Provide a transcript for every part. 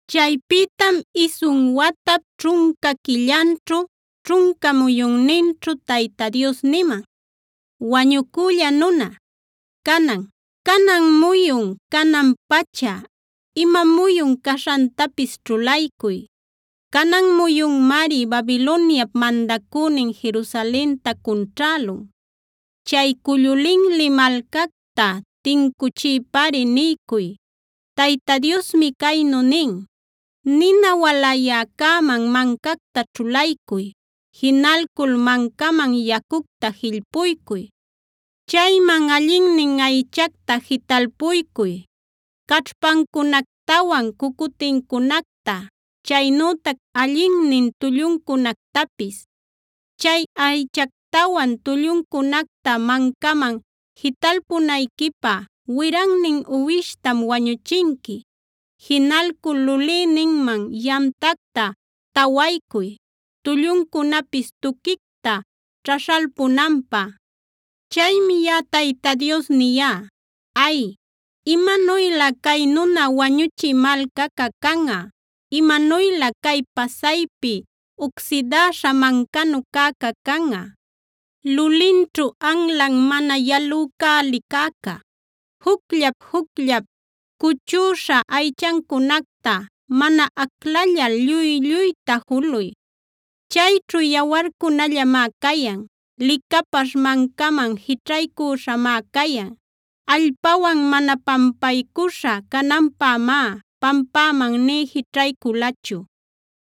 Chaypïtam isun watap ćhunca quillanćhu, ćhunca muyunninćhu Tayta Dios niman: “Wañucülla nuna, canan, canan muyun, canan-pacha ima muyun caśhantapis ćhulaycuy. Canan muyunmari Babiloniap mandacünin Jerusalenta cunćhälun. Chay cullu linli malcacta tincuchiypari niycuy. Tayta Diosmi caynu nin: “Nina walayäcäman mancacta ćhulaycuy. Jinalcul mancaman yacucta jillpuycuy. Chayman allinnin aychacta jitalpuycuy: caćhpancunactawan cucutincunacta, chaynütac allinnin tulluncunactapis. Chay aychactawan tulluncunacta mancaman jitalpunayquipä wirannin uwishtam wañuchinqui. Jinalcul lulïninman yamtacta tawaycuy tulluncunapis tuquicta ćhaśhalpunanpä. “Chaymi yaꞌa Tayta Dios niyá: “¡Ay, imanuylä cay nuna wañuchï malcaca canꞌa! ¡Imanuylä cay pasaypi ucsidäśha mancanu cäca canꞌa, lulinćhu anlan mana yalücäli cäca! Jucllap-jucllap cuchüśha aychancunacta, mana aclallal lluy lluyta juluy. Chayćhu yawarcunallamá cayan. Licapaśh wancaman jićhaycüśhamá cayan; allpawan mana pampaycuśha cananpämá pampäman nï jićhayculachu.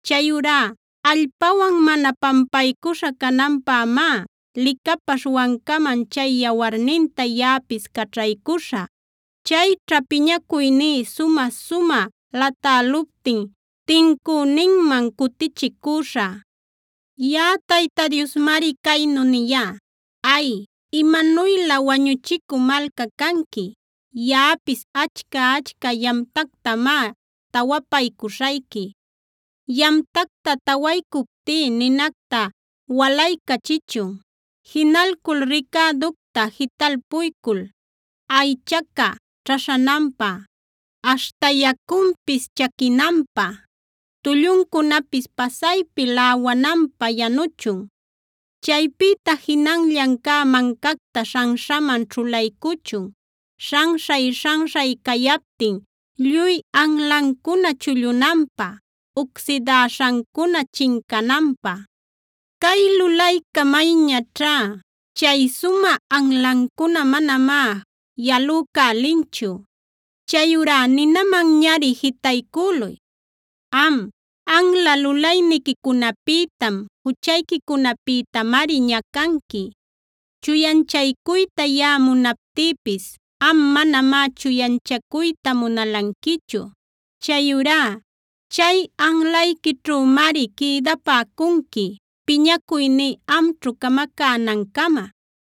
Chayurá allpawan mana pampaycuśha cananpämá, licapaśh wancaman chay yawarninta yaꞌapis caćhaycuśhä. Chayćha piñacuyní sumä-sumä latäluptin, tincüninman cutichicüśhä. Yaꞌa Tayta Diosmari caynu niyá: ¡Ay, imanuylä wañuchicü malca canqui! Yaꞌapis achca-achca yamtactamá tawapaycüśhayqui. Yamtacta tawaycuptí ninacta walaycächichun. Jinalcul ricäducta jitalpuycul aychaca ćhaśhananpä, aśhta yacunpis chaquinanpä, tulluncunapis pasaypi läwananpä yanuchun. Chaypïta jinanllan cä mancacta śhanśhaman ćhulaycuchun; śhanśhay-śhanśhay cayaptin lluy anlancuna chullunanpä, ucsidäśhancuna chincananpä. “¡Cay lulayca mayñaćhá! Chay sumä anlancuna manamá yalucälinchu. Chayurá ninämanñari jitaycüluy. Am, anla lulayniquicunapïtam, juchayquicunapïtamari ñacanqui. Chuyanchaycuyta yaꞌa munaptïpis am manamá chuyanchacuyta munalanquichu. Chayurá chay anlayquićhümari quïdapäcunqui piñacuyní amćhu camacänancama.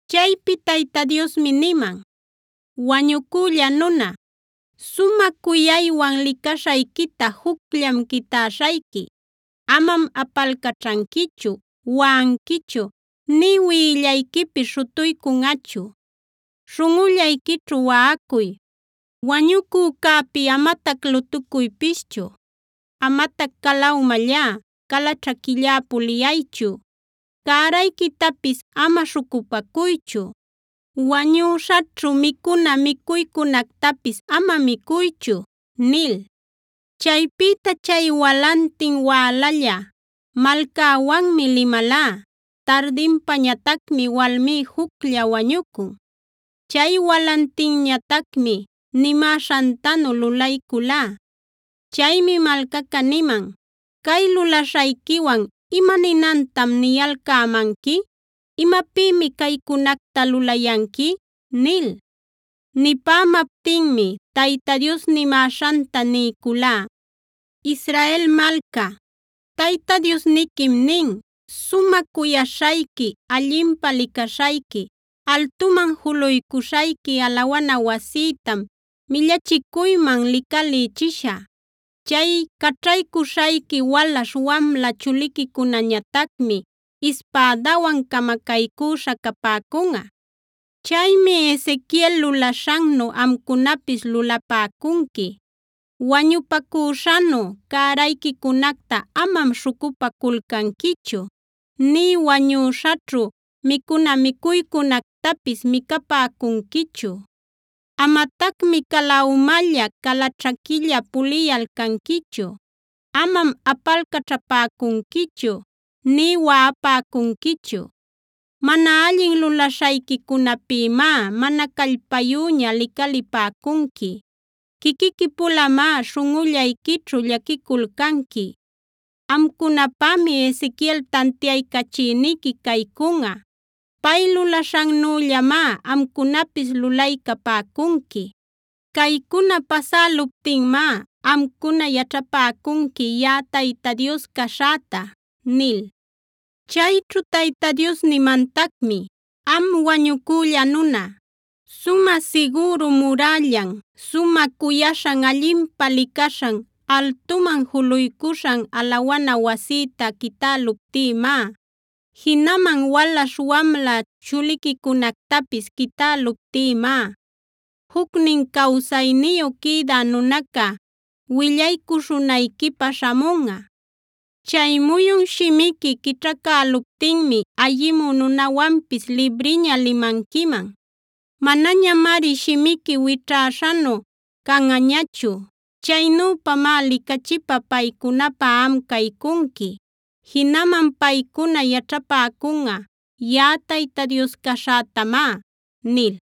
Chaypi Tayta Diosmi niman: “Wañucülla nuna, sumä cuyaywan licaśhayquita jucllam quitäśhayqui. Amam apalcaćhanquichu, waꞌanquichu nï wiꞌillayquipis śhutuycunꞌachu. Śhunꞌullayquićhu waꞌacuy. Wañucücäpi amatac lutucuypischu. Amatac cala umallá, cala ćhaquillá puliyaychu. Cärayquitapis ama śhucupacuychu; wañüśhaćhu micuna micuycunactapis ama micuychu” nil. Chaypïta chay walantin wälalla malcäwanmi limalá; tardinpañatacmi walmí juclla wañucun. Chay walantinñatacmi nimäśhantanu lulayculá. Chaymi malcaca niman: “¿Cay lulaśhayquiwan ima ninantam niyalcämanqui? ¿Imapïmi caycunacta lulayanqui?” nil. Nipämaptinmi Tayta Dios nimäśhanta niyculá: “Israel malca, Tayta Diosniquim nin: sumä cuyaśhayqui, allinpä licaśhayqui, altuman juluycuśhayqui alawana wasïtam millachicuyman licalïchishä. Chay caćhaycuśhayqui walaśh wamla chuliquicunañatacmi ispädawan camacaycüśha capäcunꞌa. Chaymi Ezequiel lulaśhannu amcunapis lulapäcunqui: Wañupacüśhanu cärayquicunacta amam śhucupaculcanquichu, nï wañuśhaćhu micuna micuycunactapis micapäcunquichu. Amatacmi cala umalla, cala ćhaquilla puliyalcanquichu. Amam apalcaćhapäcunquichu nï waꞌapäcunquichu. Mana allin lulaśhayquicunapïmá mana callpayüña licalipäcunqui, quiquiqui-pulamá śhunꞌullayquićhu llaquiculcanqui. Amcunapämi Ezequiel tantiaycachïniqui caycunꞌa. Pay lulaśhannüllamá amcunapis lulaycapäcunqui. Caycuna pasäluptinmá amcuna yaćhapäcunqui yaꞌa Tayta Dios caśhäta” nil. Chayćhu Tayta Dios nimantacmi: “Am wañucülla nuna, sumä sigüru murällan, sumä cuyaśhan, allinpä licaśhan, altuman juluycuśhan alawana wasïta quitäluptïmá, jinaman walaśh wamla chuliquicunactapis quitäluptïmá, jucnin cawsayniyu quïdä nunaca willaycuśhunayquipä śhamunꞌa. Chay muyun shimiqui quićhacäluptinmi ayimü nunäwanpis libriña limanquiman. Manañamari shimiqui wićhäśhanu canꞌañachu. Chaynüpamá licachipä paycunapä am caycunqui. Jinaman paycuna yaćhapäcunꞌa yaꞌa Tayta Dios caśhätamá” nil.